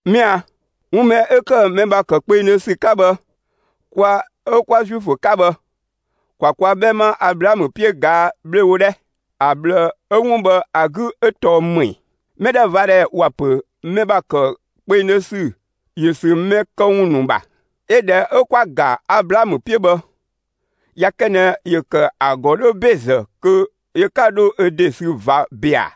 Mɛa‑, 'wun mɛ 'ö ‑kë mɛ ‑bha ‑kë kpengdhö ‑sü 'ka bhë, kwa 'ö 'kwa Zuifö 'ka bhë, ‑kwa kwa 'bhɛma Ablaamö 'piö ꞊gaa' 'bhlewo 'dhɛ! ‑A ꞊bhlë 'ö 'wun bhë ‑a 'gü 'ö tɔɔ ‑më ‑ɛ? (Mɛdhɛvadhɛ ‑wa ‑pö mɛ ‑bha ‑kë kpengdhö ‑sü ‑yö ‑sü mɛ këwun ‑nu ‑bha). 'Yö ꞊dhɛ 'ö 'kwa‑ ‑ga Ablaamö 'piö bhë, ꞊ya kë ꞊nɛ ‑yö ‑kë ‑a ‑gɔ 'dhö ‑bezë kö yö 'ka 'dho ö ‑de sü ꞊va ‑be ‑a!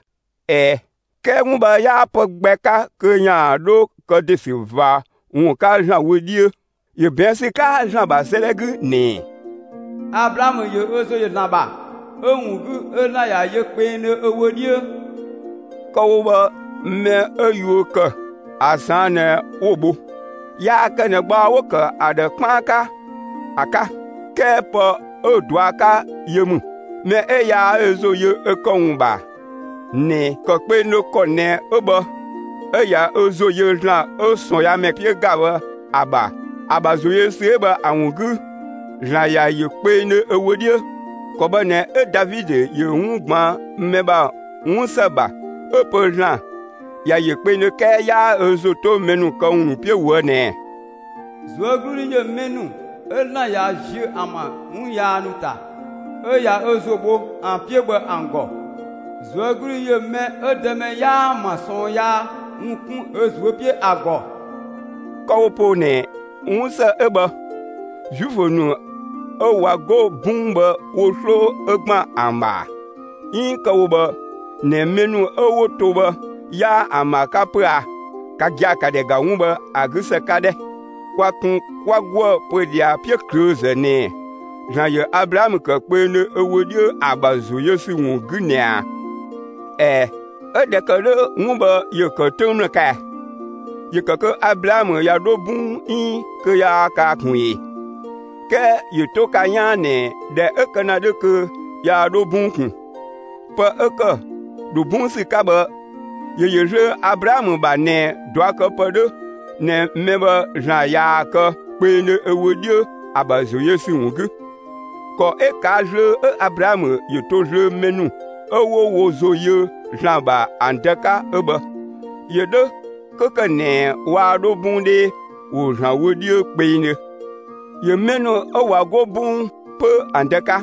꞊Ɛɛ, 'kɛɛ 'wun bhë 'yaa pë gbɛ 'ka kö ‑yaan dho kë ‑de ‑sü ꞊va ‑wun 'ka ‑Zlan wö 'dhiö! ‑Yö ꞊bɛɛn' ‑sü 'ka ‑Zlan ‑bha 'sëëdhɛ 'gü ꞊nɛ: Ablaamö ‑yö ö ‑zo yö ‑Zlan ‑bha, 'ö‑ ‑wun 'gü 'ö ‑Zlan ꞊ya yö kpengdhö ö wö 'dhiö. Kë‑ wo bhë mɛ 'ö yuö ‑kë, ‑a ꞊saan' ꞊nɛ 'wo‑ bho. Yaa kë ꞊nɛ gbaɔ 'wo‑ ‑kë ‑a ‑dhë 'kpaan 'ka ‑a 'ka; 'kɛɛ pë 'ö‑ ꞊dua' 'ka yö ‑mü. Mɛ 'ö yaa ö ‑zo yö ö këwun ‑nu ‑bha ꞊nɛ ‑kë kpengdhö ‑kɔ ꞊nɛ 'ö bhë, 'ö ꞊ya ö ‑zo yö ‑Zlan 'ö ꞊sɔɔnyaamɛ 'piö ‑ga bhë ‑a ‑bha, ‑a ‑bha ‑zo yö ‑sü 'ö bhë ‑a ‑wun 'gü, ‑Zlan ‑ya ‑yö kpengdhö ö wö 'dhiö. ‑Kɔ bhë ꞊nɛ 'ö Davidö ‑yö 'wun ꞊gbaan' mɛ ‑bha 'wunsë ‑bha 'ö‑ pö ‑Zlan ‑ya yö kpengdhö 'kɛɛ 'yaa ö ‑zo 'to mɛ këwun ‑nu 'piö ꞊woë' ꞊nɛɛ: ꞊Zuögludhi ‑yö mɛ ‑nu 'ö ‑Zlan ꞊ya ziö ‑an ‑bha 'wun yaa ‑nu ‑ta 'ö ꞊ya ö ‑zo bho ‑an 'piö bhë ‑an ‑gɔ! ꞊Zuögludhi ‑yö mɛ 'ö Dëmɛ 'yaa‑ ‑bha ꞊sɔɔn yaa ‑wun 'kun ö ꞊zuö' 'piö ‑a ‑gɔ! Kë‑ wo poo ꞊nɛ 'wunsë 'ö bhë, Zuifö ‑nu 'ö ꞊wa 'go 'bɔng bhë wo 'sloo 'ö ‑gban ‑an ‑bha ‑a? 'Iin kë‑ wo bhë ꞊nɛ mɛ ‑nu 'ö 'wo to bhë 'yaa ‑an ‑bha 'ka 'pö a? Ka gia‑, ‑ka ‑dhɛ ‑ga 'wun bhë ‑a 'gü ‑së 'ka 'dhɛ! Kwa kun 'kwa 'goë‑ pö ꞊dhia 'piöklöözë ꞊nɛɛ: ‑Zlan ‑yö Ablaamö ‑kë kpengdhö ö wö 'dhiö ‑a ‑bha ‑zo yö ‑sü ‑wun 'gü ꞊nɛ ꞊a? ꞊Ɛɛ, 'ö ꞊dhɛ ‑kë 'dhö, 'wun bhë ‑yö ‑kë 'töng ‑mlë 'ka ɛɛ? ‑Yö ‑kë kö Ablaamö ꞊ya 'dho 'bɔng 'iin kö yaa kaa ꞊kun ee? 'Kɛɛ ‑yö 'to ka 'yaan ꞊nɛ ꞊dhɛ 'ö kë ‑na 'dhö kö yaa 'dho 'bɔng ꞊kun. Pë 'ö ‑kë ‑dho 'bɔng ‑sü 'ka bhë, ‑yö ‑yö zlöö Ablaamö ‑bha ꞊nɛ ꞊duakëpë 'dhö ꞊nɛ mɛ bhë ‑Zlan ꞊yaa‑ kë kpengdhö ö wö 'dhiö ‑a ‑bha ‑zo yö ‑sü ‑wun 'gü; ‑kɔ 'ö ꞊kaa' zlöö 'ö Ablaamö ‑yö to zlöö mɛ ‑nu 'ö 'wo wo ‑zo yö ‑Zlan ‑bha bhë ‑an dë 'ka 'ö bhë; ‑yö 'dhö 'kö ‑kë ꞊nɛ waa 'dho 'bɔng 'dhee, ‑wo ‑Zlan wö 'dhiö kpengdhö. ‑Yö mɛ ‑nu 'ö ꞊wa 'go 'bɔng 'pö ‑an dë 'ka.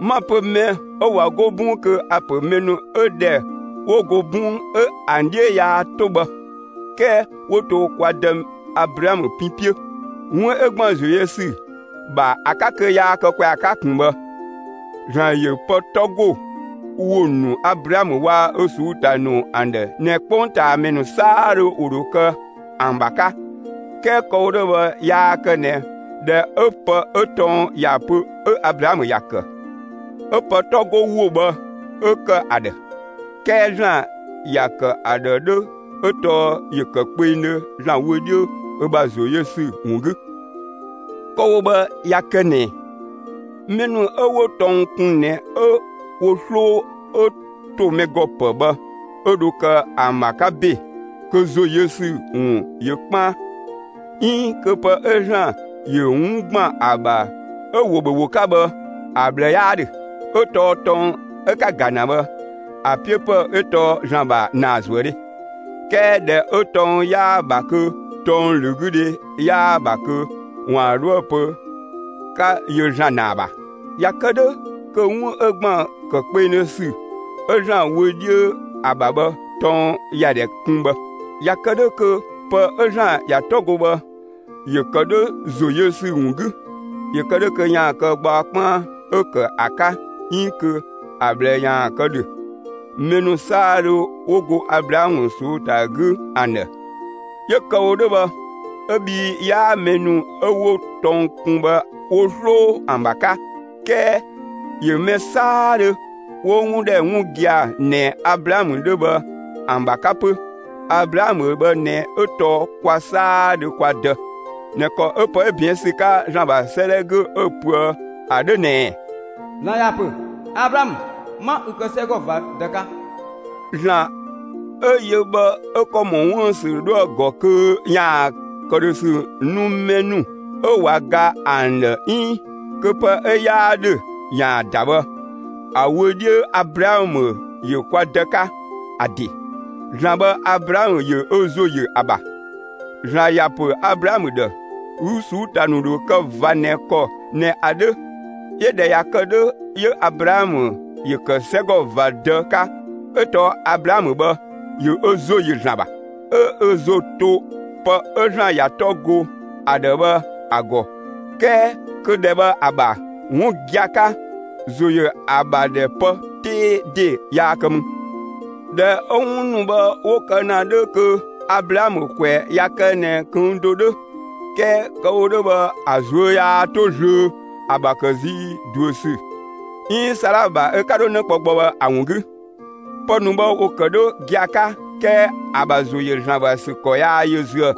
'Ma‑ 'pö mɛ 'ö ꞊wa 'go 'bɔng kö a‑ ‑pö mɛ ‑nu 'ö ꞊dhɛ 'wo go 'bɔng 'ö ‑an 'dhiö yaa 'to bhë 'kɛɛ 'wo to kwa dë Ablaamö pin 'piö, 'wun 'ö ‑gban ‑zo yö ‑sü ‑bha ‑a 'ka kö yaa kë ‑kwɛa 'ka ꞊kun bhë. ‑Zlan ‑yö pë 'tɔ 'go ‑wo ‑nu Ablaamö waa‑ ö ꞊suu'‑ ‑ta ‑nu ‑an ‑dhë ꞊nɛ 'kpongtaamɛ ‑nu 'saadhö ‑wo ‑dho kë ‑an ‑bha 'ka. 'Kɛɛ kë‑ wo 'dhö bhë yaa kë ꞊nɛ, ꞊dhɛ 'ö pë 'ö tɔng ‑ya pö 'ö Ablaamö ‑ya ‑kë, 'ö pë 'tɔ 'go ‑wo bhë 'ö ‑kë ‑a ‑dhë. 'Kɛɛ ‑Zlan ‑ya ‑kë ‑a ‑dhë 'dhö 'ö tɔɔ ‑yö ‑kë kpengdhö ‑Zlan wö 'dhiö ö ‑bha ‑zo yö ‑sü ‑wun 'gü. Kë‑ wo bhë ꞊ya kë ꞊nɛ mɛ ‑nu 'ö 'wo tɔng kun ꞊nɛ 'ö wo 'sloo 'ö ‑to mɛ ‑gɔ ‑pë bhë 'ö dho kë ‑an ‑bha 'ka ‑be, kö ‑zo yö ‑sü ‑wun ‑yö 'kpaan, 'iin kö pë 'ö ‑Zlan ‑yö 'wun ‑gban ‑a ‑bha 'ö‑ ‑wo ‑bhö ‑wo 'ka bhë, ‑a ꞊bhlë 'yaa 'dhö. 'Ö tɔɔ tɔng 'ö‑ 'ka‑ ‑ga ‑na bhë, ‑a 'piö ‑pë 'ö tɔɔ ‑Zlan ‑bha ‑naazuëdhe; 'kɛɛ ‑dhɛ 'ö tɔng 'yaa‑ ‑bha kö tɔng ‑lö 'gü dhe 'yaa‑ ‑bha kö ‑waan 'dhoë‑ pö 'ka yö ‑Zlan ‑naa ‑bha. ꞊Ya kë 'dhö kö 'wun 'ö ‑gban ‑kë kpengdhö ‑sü 'ö ‑Zlan wö 'dhiö ‑a ‑bha bhë tɔng ‑ya ‑dhɛ kun bhë. ꞊Ya kë 'dhö kö pë 'ö ‑Zlan ‑ya 'tɔ go bhë, ‑yö ‑kë 'dhö ‑zo yö ‑sü ‑wun 'gü, ‑yö kë 'dhö kö ‑yaan kë gbaɔ 'kpaan 'ö ‑kë ‑a 'ka 'iin kö ‑a ꞊bhlë ‑yaan kë ‑dhö, mɛ ‑nu 'saadhö 'wo go Ablaamö ꞊suu'‑ ‑ta 'gü ‑an ‑dhë; 'yö kë‑ wo 'dhö bhë 'ö bhii 'yaa mɛ ‑nu 'ö 'wo tɔng kun bhë wo 'sloo ‑an ‑bha 'ka. 'Kɛɛ ‑yö mɛ 'saadhö 'wo 'wun ‑dhɛ 'wun gia‑ ꞊nɛ Ablaamö 'dhö bhë, ‑an ‑bha 'ka 'pö. Ablaamö bhë ꞊nɛ 'ö tɔɔ kwa 'saadhö kwa dë ꞊nɛ ‑kɔ 'ö pë 'ö ꞊bɛɛn' ‑sü 'ka ‑Zlan ‑bha 'sëëdhɛ 'gü 'ö‑ pöë ‑a 'dhö ꞊nɛɛ: (‑Zlan ‑ya ‑pö: Ablaamö,) 'ma ü kë 'sɛgɔ ꞊va dë 'ka. ‑Zlan 'ö yö bhë 'ö ‑kɔ ‑mɔ 'wuën‑ ‑sü 'dhoë‑ ‑gɔ kö ‑yaan ‑këdhösü nu mɛ ‑nu 'ö ꞊wa ga ‑an ‑dhë 'iin kö pë 'ö 'yaa ‑dhö ‑yaan ‑da bhë, ‑a wö 'dhiö Ablaamö ‑yö kwa dë 'ka. ‑A ‑de, ‑Zlan bhë, Ablaamö ‑yö ö ‑zo ‑yö ‑a ‑bha. ‑Zlan ‑ya ‑pö Ablaamö ‑dhë: Ü ꞊suu'‑ ‑ta ‑nu ‑dho kë ꞊va ꞊nɛ ‑kɔ ꞊nɛ ‑a 'dhö. 'Yö ꞊dhɛ ‑kë 'dhö 'yö Ablaamö ‑yö ‑kë 'sɛgɔ ꞊va dë 'ka 'ö tɔɔ Ablaamö bhë, ‑yö ö ‑zo ‑yö ‑Zlan ‑bha, 'ö ö ‑zo to pë 'ö ‑Zlan ‑ya 'tɔ go ‑a ‑dhë bhë ‑a ‑gɔ 'kɛɛ kö ‑dhɛ bhë ‑a ‑bha, ('wun gia‑ 'ka, ‑zo ‑yö ‑a ‑bha ‑dhɛ pë 'tee ‑de yaa kë mü). ꞊Dhɛ 'ö 'wun ‑nu bhë 'wo kë ‑na 'dhö kö Ablaamö ‑kwɛ ꞊ya kë ꞊nɛ ꞊këng' do 'dhö; 'kɛɛ kë‑ wo 'dhö bhë, ‑a ꞊zuö' yaa 'to zlöö ‑a ‑bha ‑kë zii ꞊duö ‑sü 'iin Saala ‑bha ö 'ka 'dho 'në kpɔ gbɔ bhë ‑a ‑wun 'gü. Pë ‑nu bhë ‑wo ‑kë 'dhö gia‑ 'ka 'kɛɛ ‑a ‑bha ‑zo ‑yö ‑Zlan ‑bha ‑sü ‑kɔ yaa yö züë‑,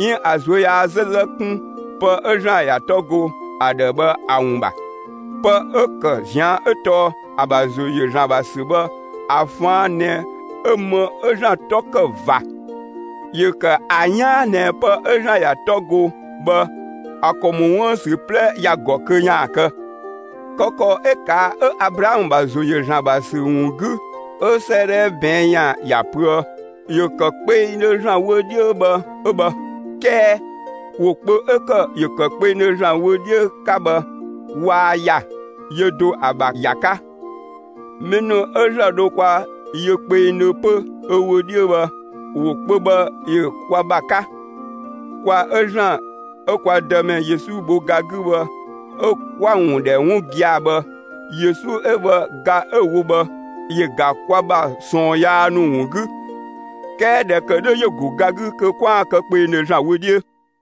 'iin ‑a ꞊zuö' yaa 'zëzë 'kun pë 'ö ‑Zlan ‑ya 'tɔ go ‑a ‑dhë bhë ‑a ‑wun ‑bha. Pë 'ö ‑kë ꞊zian' 'ö tɔɔ ‑a ‑bha ‑zo ‑yö ‑Zlan ‑bha ‑sü bhë ‑a ꞊faan' ꞊nɛ 'ö më 'ö ‑Zlan 'tɔ ‑kë ꞊va. ‑Yö ‑kë ‑a 'yaan ꞊nɛ pë 'ö ‑Zlan ‑ya 'tɔ go bhë, ‑a ‑kɔ ‑mɔ 'wuën‑ ‑sü 'plɛ ‑ya ‑gɔ kö ‑yaan kë. Kë ‑kɔ 'ö ꞊kaa' 'ö Ablaamö ‑bha ‑zo ‑yö ‑Zlan ‑bha ‑sü ‑wun 'gü 'ö 'sëëdhɛ ꞊bɛɛn' ‑yan ‑ya pöë: ‑Yö ‑kë kpengdhö ‑Zlan wo 'dhiö bhë 'ö bhë. 'Kɛɛ ‑wo kpö 'ö ‑kë «‑yö ‑kë kpengdhö ‑Zlan wö 'dhiö» 'ka bhë, waa ‑ya, yö do ‑a ‑bha ‑ya 'ka. Mɛ ‑nu 'ö ‑Zlan dho kwa yö kpengdhö 'pö ö wö 'dhiö bhë, ‑wo kpö bhë ‑yö kwa ‑bha 'ka, kwa 'ö ‑Zlan 'ö kwa Dëmɛ Yesu bho ga 'gü bhë 'ö kwa‑ ‑wun ‑dhɛ 'wun gia‑ bhë. Yesu 'ö bhë, ga 'ö‑ wo bhë, ‑yö ‑ga kwa ‑bha ꞊sɔɔn yaa ‑nu ‑wun 'gü. 'Kɛɛ ꞊dhɛ ‑kë 'dhö ‑yö ‑go ga 'gü kö 'kwaan‑ kë kpengdhö ‑Zlan wö 'dhiö.